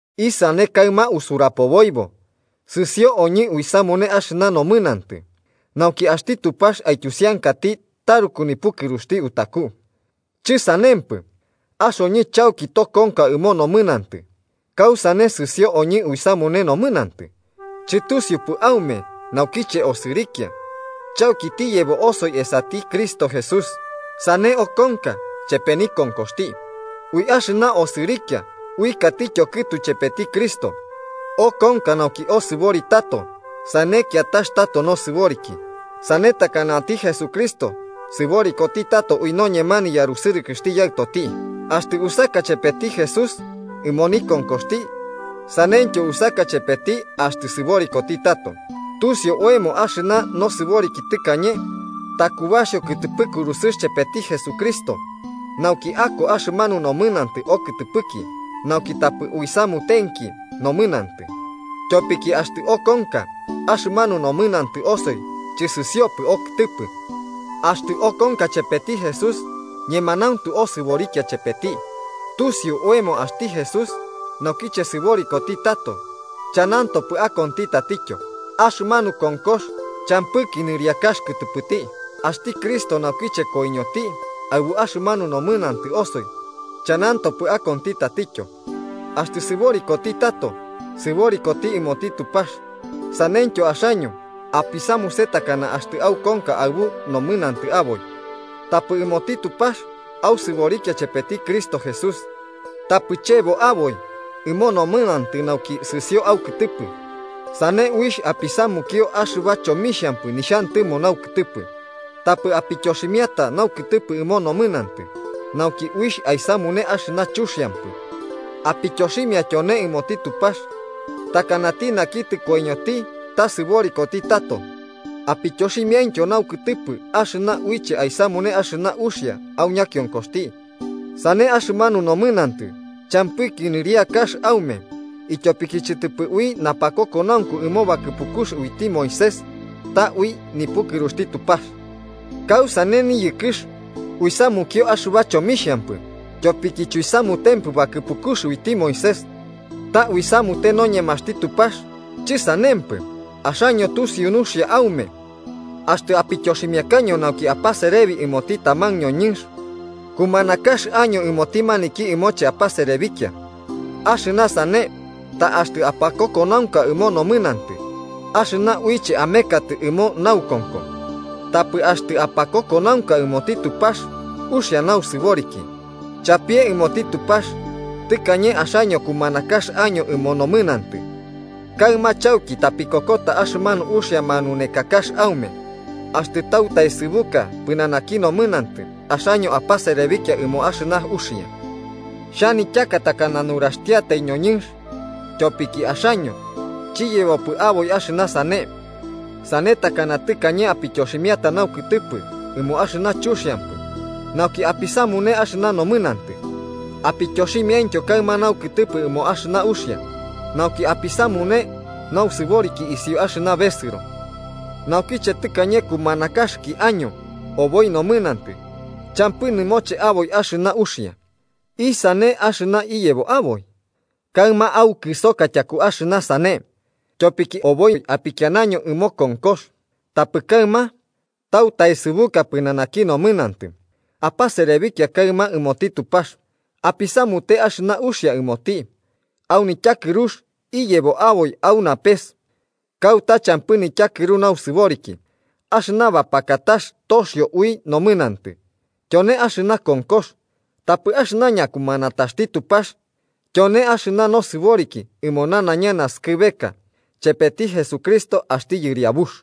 ¿Isane kaɨma usurapoboibo? ¿Sɨsio oñɨ uisamune axɨba nomɨnantɨ, nauki axti Tupax aityusiankati taruku nipukɨruxti utaku? ¡Chɨsanempɨ! Axoñɨ chauki tokonka ɨmo nomɨnantɨ. ¿Kausane sɨsio oñɨ uisamune nomɨnantɨ? ¿Chɨtusiupɨ aume naukiche osɨrikia chauki tiyebo osoi esati Cristo Jesús, sane okonka chepe nikonkoxti? Ui axɨna osɨrikia uɨkatityo kɨtu ichepeti Cristo, okonka nauki osɨbori tato sane kiatax tato nosɨboriki. Sane takanati Jesucristo sɨborikoti tato ui noñema niyarusɨrɨkɨxti Yaɨtoti. Axtɨ usaka chepeti Jesús ɨmo nikonkoxti, saneityo usaka chepeti axtɨ sɨborikoti tato. Tusiu oemo axɨna nosɨboriki tɨkañe takubaxio kɨtɨpɨ kurusɨx chepeti Jesucristo, nauki ako axɨmanu nomɨnantɨ okɨtɨpɨki nauki tapɨ uisamutenki nomɨnantɨ. Tyopiki axtɨ okonka axɨmanu nomɨnantɨ osoi chɨsɨsiopɨ okɨtɨpɨ. Axtɨ okonka chepeti Jesús, ñemanauntu osɨborikia chepeti. Tusiu oemo axti Jesús, naukiche sɨborikoti tato, chanantopɨ akonti tatityo. Axɨmanu konkox champɨki nɨriakax kɨtɨpɨti. Axti Cristo naukiche koiñoti aɨbu axɨmanu nomɨnantɨ osoi chanantopɨ akonti tatityo. Axtɨ sɨborikoti tato, sɨborikoti ɨmoti Tupax. Saneityo axaño apisamuse takana axtɨ aukonka aɨbu nomɨnantɨ aboi, tapɨ ɨmoti Tupax ausɨborikia chepeti Cristo Jesús. Tapɨ chebo aboi ɨmo nomɨnantɨ nauki sɨsio aukɨtɨpɨ sane uixh apisamukio axɨba chomixhampɨ nixhantɨmo naukɨtɨpɨ. Tapɨ apityoximiata naukɨtɨpɨ ɨmo nomɨnantɨ, nauki uixh aisamune axɨna chuxiampɨ. Apityoximia tyone ɨmoti Tupax, takanati naki tɨkoiñoti ta sɨborikoti tato, apityoximiaintyo naukɨtɨpɨ axɨna uiche aisamune axɨna uxia au ñakionkoxti. Sane axɨmanu nomɨnantɨ champɨki nɨriakax aume, ityopiki chɨtɨpɨ ui napakokonaunku ɨmo bakɨpukux uiti Moisés, ta ui nipukɨruxti Tupax. ¿Kausane niyɨkɨx? ¿Uisamukio axɨba chomixhampɨ tyopiki chuisamutempɨ bakɨpukux uiti Moisés, ta uisamute noñemaxti Tupax? ¡Chɨsanempɨ! Axaño tusiu nuxia aume axtɨ apityoximiakaño nauki apaserebi ɨmoti taman ñoñɨnx, kumanakax año ɨmoti maniki ɨmoche apaserebikia. Axɨna sane, ta axtɨ apakokonaunka ɨmo nomɨnantɨ, axɨna uiche amekatɨ ɨmo naukonko, tapɨ axtɨ apakokonaunka ɨmoti Tupax uxia nausɨboriki. Chapie ɨmoti Tupax, tɨkañe axaño kumanakax año ɨmo nomɨnantɨ, kaɨma chauki tapikokota axɨmanu uxia manunekatax aume. Axtɨ tautaesɨbuka pɨnanaki nomɨnantɨ, axaño apaserebikia ɨmo axɨna uxia. (Xhanityaka takana nuraxtiatai ñoñɨnx, tyopiki axaño chiyebopɨ aboi axɨna sane.) Sane takana tɨkañe apityoximiata naukɨtɨpɨ ɨmo axɨna chuxiampɨ nauki apisamune axɨna nomɨnantɨ, apityoximiaintyo kaɨma naukɨtɨpɨ ɨmo axɨna uxia, nauki apisamune nausɨboriki isiuki axɨna besɨro. Naukiche tɨkañe kumanakaxɨki año oboi nomɨnantɨ, champɨ nɨmoche aboi axɨna uxia. ¿Isane axɨna iyebo aboi? Kaɨma aukɨsoka tyaku axɨna sane, tyopiki oboi apikianaño ɨmo konkox. Tapɨ kaɨma, tautaesɨbuka pɨnanaki nomɨnantɨ, apaserebikia kaɨma ɨmoti Tupax. Apisamute axɨna uxia ɨmoti. Au nityakɨrux iyebo aboi au napes, kauta champɨ nityakɨru nausɨboriki. Axɨna bapakatax toxio ui nomɨnantɨ, tyone axɨna konkox, tapɨ axɨna ñakumanataxti Tupax tyone axɨna nosɨboriki ɨmo nanaiña naskɨbeka chepeti Jesucristo axti Yɨriabux.